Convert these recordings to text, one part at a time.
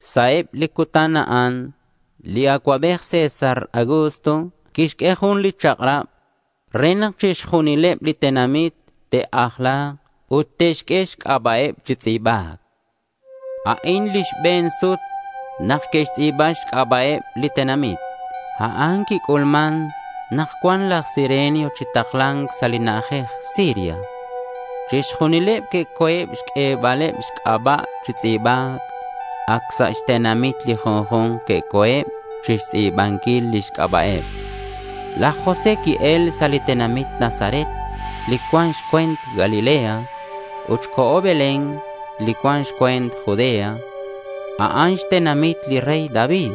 Sa' eb li cutan a'an li acuabej César Augusto quixq'ue jun li chak'rab re nak chixjunileb li tenamit te'ajla̱k ut te'xq'ue xc'aba'eb chi tz'i̱ba̱c. A'in li xbe̱n sut nak que'xtz'i̱ba xc'aba'eb li tenamit. A'an quic'ulman nak cua̱nk laj Cirenio chi takla̱nc sa' li na'ajej Siria. Chixjunileb que'co̱eb xq'uebaleb xc'aba' chi tz'i̱ba̱c. Ac sa' xtenamiteb li junju̱nk que'co̱eb chixtz'i̱banquileb lix c'aba'. Laj José qui-el sa' li tenamit Nazaret li cuan sa' xcue̱nt Galilea ut co̱ Belén li cuan xcue̱nt Judea. A'an xtenamit li rey David.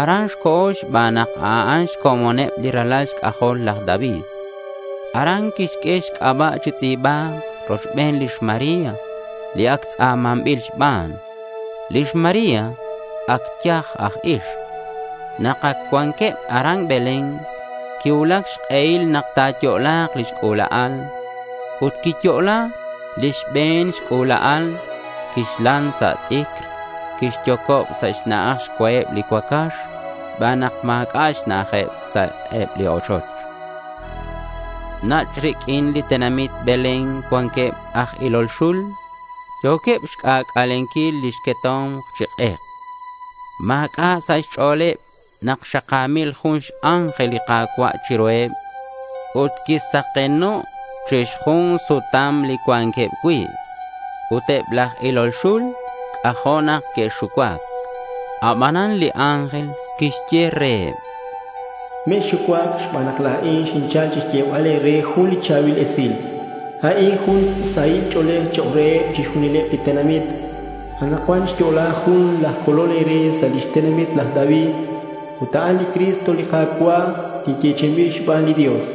Aran co̱ xban nak a'an xcomoneb li ralal xc'ajol laj David. Aran quixq'ue xc'aba' chi tz'i̱ba̱c rochben lix María li ac tz'a̱manbil xban. Lix María ac yaj aj ixk. Nak ac cuanqueb aran Belén quicuulac xk'ehil nak ta̱yo'la̱k lix c'ula'al. Ut quiyo'la li xbe̱n xc'ula'al, quixlan sa' t'icr ut quixyocob sa' xna'aj xcuaheb li cuacax xban nak ma̱c'a' xna'ajeb sa' eb li ochoch. Nach' riq'uin li tenamit Belén cuanqueb aj ilol xul yo̱queb chixc'ac'alenquil lix queto̱mk chi k'ek. Ma̱c'a' sa' xch'o̱leb nak xaka̱mil jun x-ángel li Ka̱cua' chiruheb. Ut quisakeno' chi xjun sutam li cuanqueb cui'. Ut eb laj ilol xul c'ajo' nak que'xucuac. Abanan li ángel quixye reheb: —Mexxucuac xban nak la̱in xinchal xyebal e̱re jun cha̱bil esilal. A'in jun sahil ch'o̱lej chok' reheb chixjunileb li tenamit. Anakcuan xyo'la jun laj Colol e̱re sa' lix tenamit laj David ut a'an li Cristo li Ka̱cua' li yechi'inbil xban li Dios.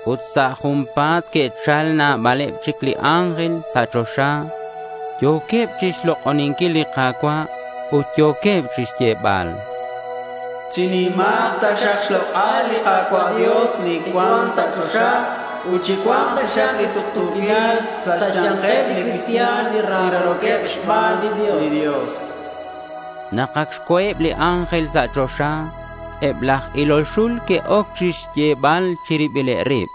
Ut sa' junpa̱t que'chal nabaleb chic li ángel sa' choxa. Yo̱queb chixlok'oninquil li Ka̱cua' ut yo̱queb chixyebal: —Chinima̱k taxak xlok'al li Ka̱cua' Dios li cuan sa' choxa ut chicua̱nk taxak li tuktu̱quilal sa' xya̱nkeb li cristian li raro̱queb xban li Dios.— Nak ac xco̱eb li ángel sa' choxa, eb laj ilol xul que'oc chixyebal chi ribileb rib: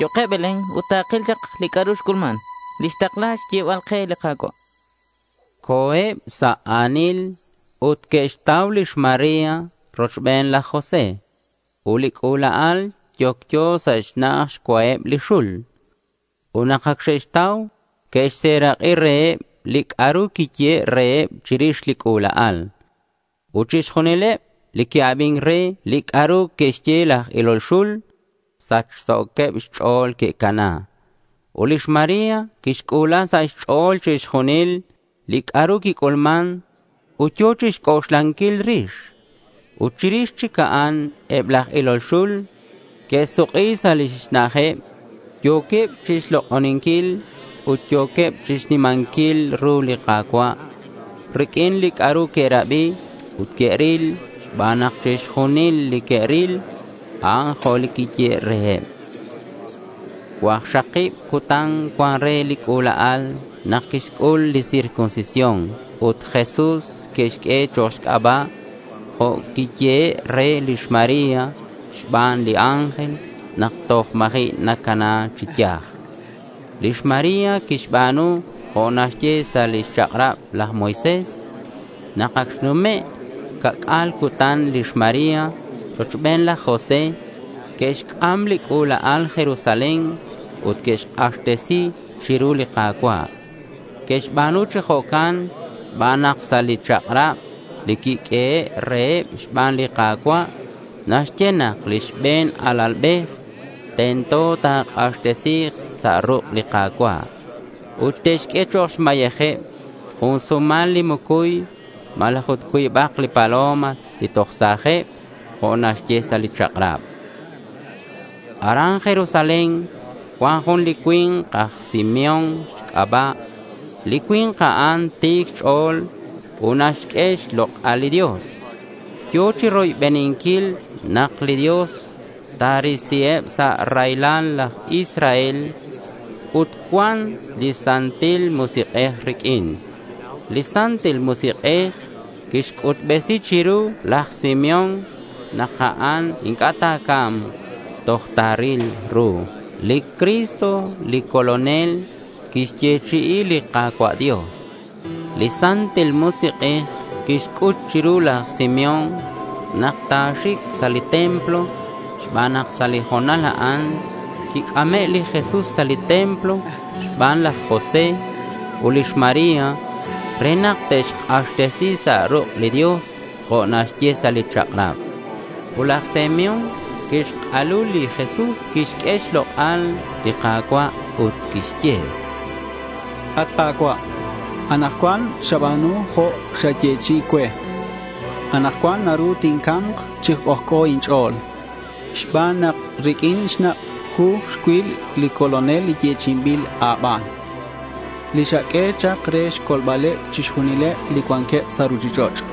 —Yo̱keb Belén ut takil chak li c'a'ru xc'ulman, li xtakla xyebal ke li Ka̱cua', chanqueb. Co̱eb sa' a̱nil ut que'xtau lix María rochben laj José ut li c'ula'al yocyo sa' xna'aj xcuaheb li xul. Ut nak ac xe'xtau, que'xserak'i reheb li c'a'ru quiyehe' reheb chirix li c'ula'al. Ut chixjunileb li que'abin re li c'a'ru que'xye laj ilol xul, sachso̱queb xch'o̱l que'cana. Ut lix María quixc'u̱la sa' xch'o̱l chixjunil li c'a'ru quic'ulman ut yo̱ chixc'oxlanquil rix. Ut chirix chic a'an eb laj ilol xul que'suk'i sa' lix na'ajeb. Yo̱queb chixlok'oninquil ut yo̱queb chixnimanquil ru li Ka̱cua' riq'uin li c'a'ru que'rabi ut que'ril xban nak chixjunil li que'ril, a'an jo' li quiyehe' reheb. Cuakxakib cutan cuan re li c'ula'al nak quixc'ul li circuncisión ut Jesús que'xq'ue chok' xc'aba', jo' quiyehe' re lix María xban li ángel nak toj ma̱ji' nacana chi yaj. Lix María quixba̱nu jo' naxye sa' lix chak'rab laj Moisés. Nak ac xnume' ca'c'a̱l cutan, lix María rochben laj José que'xc'am li c'ula'al Jerusalén ut que'xk'axtesi chiru li Ka̱cua'. Que'xba̱nu chi jo'can xban nak sa' li chak'rab li quiq'uehe' reheb xban li Ka̱cua' naxye nak li xbe̱n alalbej tento ta̱k'axtesi̱k sa' ruk' li Ka̱cua'. Ut te'xq'ue chok' xmayejeb jun sumalak li mucuy malaj ut cuibak li paloma li toj sa̱jeb, jo' naxye sa' li chak'rab. Aran Jerusalén cuan jun li cui̱nk aj Simeón xc'aba'. Li cui̱nk a'an ti̱c xch'o̱l ut naxq'ue xlok'al li Dios. Yo̱ chiroybeninquil nak li Dios ta̱risiheb sa' raylal laj Israel. Ut cuan li Santil Musik'ej riq'uin. Li Santil Musik'ej quixc'utbesi chiru laj Simeón nak a'an inc'a' ta̱ca̱mk toj ta̱ril ru li Cristo li Colonel li quixyechi'i li Ka̱cua' Dios. Li Santil Musik'ej quixc'ut chiru laj Simeón nak ta̱xic sa' li templo xban nak sa' li ho̱nal a'an quic'ame' li Jesús sa' li templo xban laj José ut lix María re nak te'xk'axtesi sa' ruk' li Dios jo' naxye sa' li chak'rab. Ut laj Simeón quixk'alu li Jesús, quixq'ue xlok'al li Ka̱cua' ut quixye: —At Ka̱cua', anakcuan xaba̱nu jo' xayechi'i cue. Anakcuan naru tinca̱mk chi c'ojc'o inch'o̱l, xban nak riq'uin xnak' cuu xcuil li Colonel li yechi'inbil a̱ban, li xaq'ue chak re xcolbaleb chixjunileb li cuanqueb sa' ruchich'och'.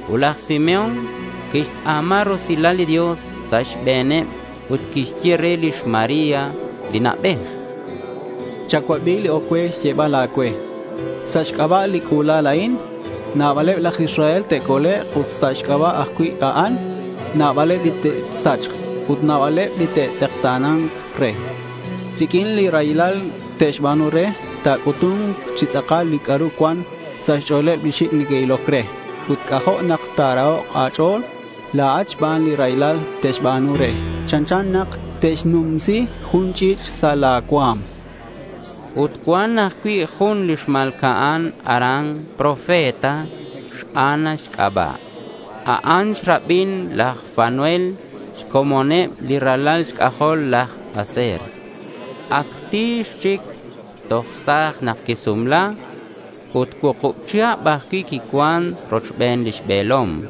Ut laj Simeón quixtz'a̱ma rusilal li Dios sa' xbe̱neb ut quixye re lix María li na'bej: —Chacuabi li oc cue xyebal a̱cue. Sa' xc'aba' li c'ula'al a'in, nabaleb laj Israel te'colek' ut sa' xc'aba' ajcui' a'an nabaleb li te'sachk. Ut nabaleb li te'tz'ekta̱na̱nk re. Riq'uin li raylal te'xba̱nu re, ta̱c'utu̱nk chi tz'akal li c'a'ru cuan sa' xch'o̱leb li xic' neque'iloc re. Ut c'ajo' nak ta̱rahok' a̱ch'o̱l la̱at xban li raylal te'xba̱nu re. Chanchan nak te'xnumsi jun ch'i̱ch' sa' la̱ cua̱m, chan laj Simeón. Ut cuan ajcui' jun li xma̱lca'an aran profeta, xAna xc'aba'. A'an xrabin laj Fanuel xcomoneb li ralal xc'ajol laj Aser. Ac ti̱x chic. Toj sa̱j nak quisumla ut cuukub chihab ajcui' quicuan rochben lix be̱lom.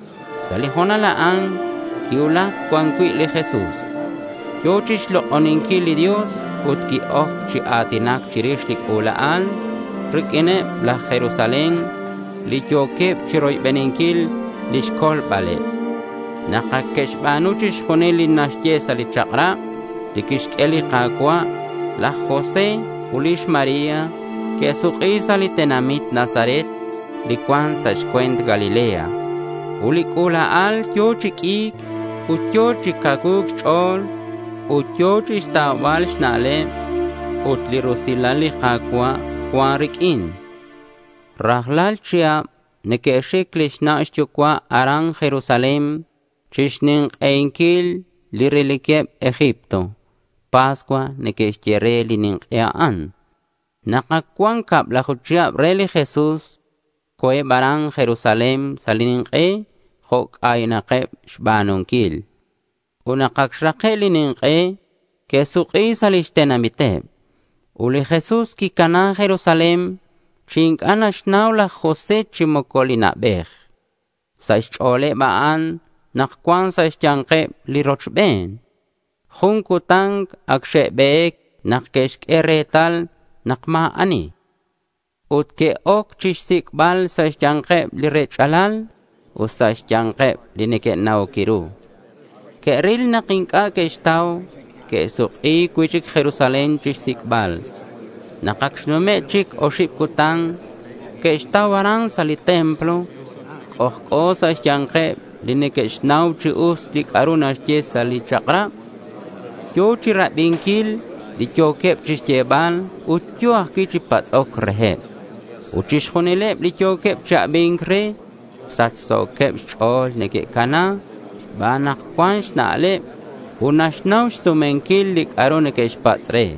Sa' li ho̱nal a'an quicuulac cuan cui' li Jesús. Yo̱ chixlok'oninquil li Dios ut qui-oc chi a̱tinac chirix li c'ula'al riq'uineb laj Jerusalén li yo̱queb chiroybeninquil lix colbaleb. Nak ac que'xba̱nu chixjunil li naxye sa' li chak'rab li quixq'ue li Ka̱cua', laj José ut lix María que'suk'i sa' li tenamit Nazaret li cuan sa' xcue̱nt Galilea. Ut li c'ula'al yo̱ chi q'ui̱c ut yo̱ chi cacuu̱c xch'o̱l. Ut yo̱ chixtaubal xna'leb. Ut li rusilal li Ka̱cua' cuan riq'uin. Rajlal chihab neque'xic lix na' xyucua' aran Jerusalén chixnink'einquil li reliqueb Egipto. Pascua neque'xye re li nink'e a'an. Nak ac cuan cablaju chihab re li Jesús, co̱eb aran Jerusalén sa' li nink'e jo' c'aynakeb xba̱nunquil. Ut nak ac xrake' li nink'e que'suk'i sa' lix tenamiteb. Ut li Jesús quicana Jerusalén chi inc'a' naxnau laj José chi moco li na'bej. Sa' xch'o̱leb a'an nak cuan sa' xya̱nkeb li rochben. Jun cutan ac xe'be̱c nak que'xq'ue retal nak ma̱ ani. Ut que'oc chixsic'bal sa' xya̱nkeb li rech'alal ut sa' xya̱nkeb li neque'na'oc ru. Que'ril nak inc'a' que'xtau. Que'suk'i cui'chic Jerusalén chixsic'bal. Nak ac xnume' chic oxib cutan, que'xtau aran sa' li templo. C'ojc'o sa' xya̱nkeb li neque'xnau chi us li c'a'ru naxye sa' li chak'rab. Yo̱ chirabinquil li yo̱queb chixyebal ut yo̱ ajcui' chi patz'oc reheb. Ut chixjunileb li yo̱queb chi abi̱nc re sachso̱queb xch'o̱l neque'cana xban nak cuan xna'leb ut naxnau xsumenquil li c'a'ru neque'xpatz' re.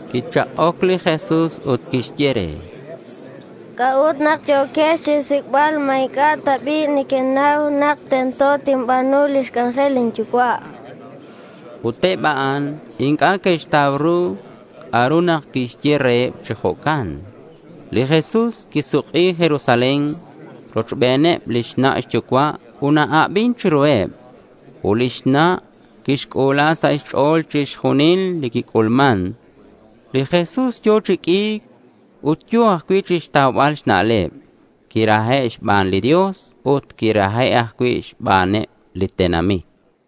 Quichak'oc li Jesús ut quixye re: —¿C'a'ut nak yo̱quex chinsic'bal? ¿Ma inc'a' ta bi' nequenau nak tento tinba̱nu lix c'anjel lin Yucua'? chan li Jesús. Ut eb a'an inc'a' que'xtau ru c'a'ut nak quixye reheb chi jo'can. Li Jesús quisuk'i Jerusalén rochbeneb lix na' xyucua' ut na-abin chiruheb. Ut lix na' quixc'u̱la sa' xch'o̱l chixjunil li quic'ulman. Li Jesús yo̱ chi q'ui̱c ut yo̱ ajcui' chixtaubal xna'leb. Quirahe' xban li Dios ut quirahe' ajcui' xbaneb li tenamit.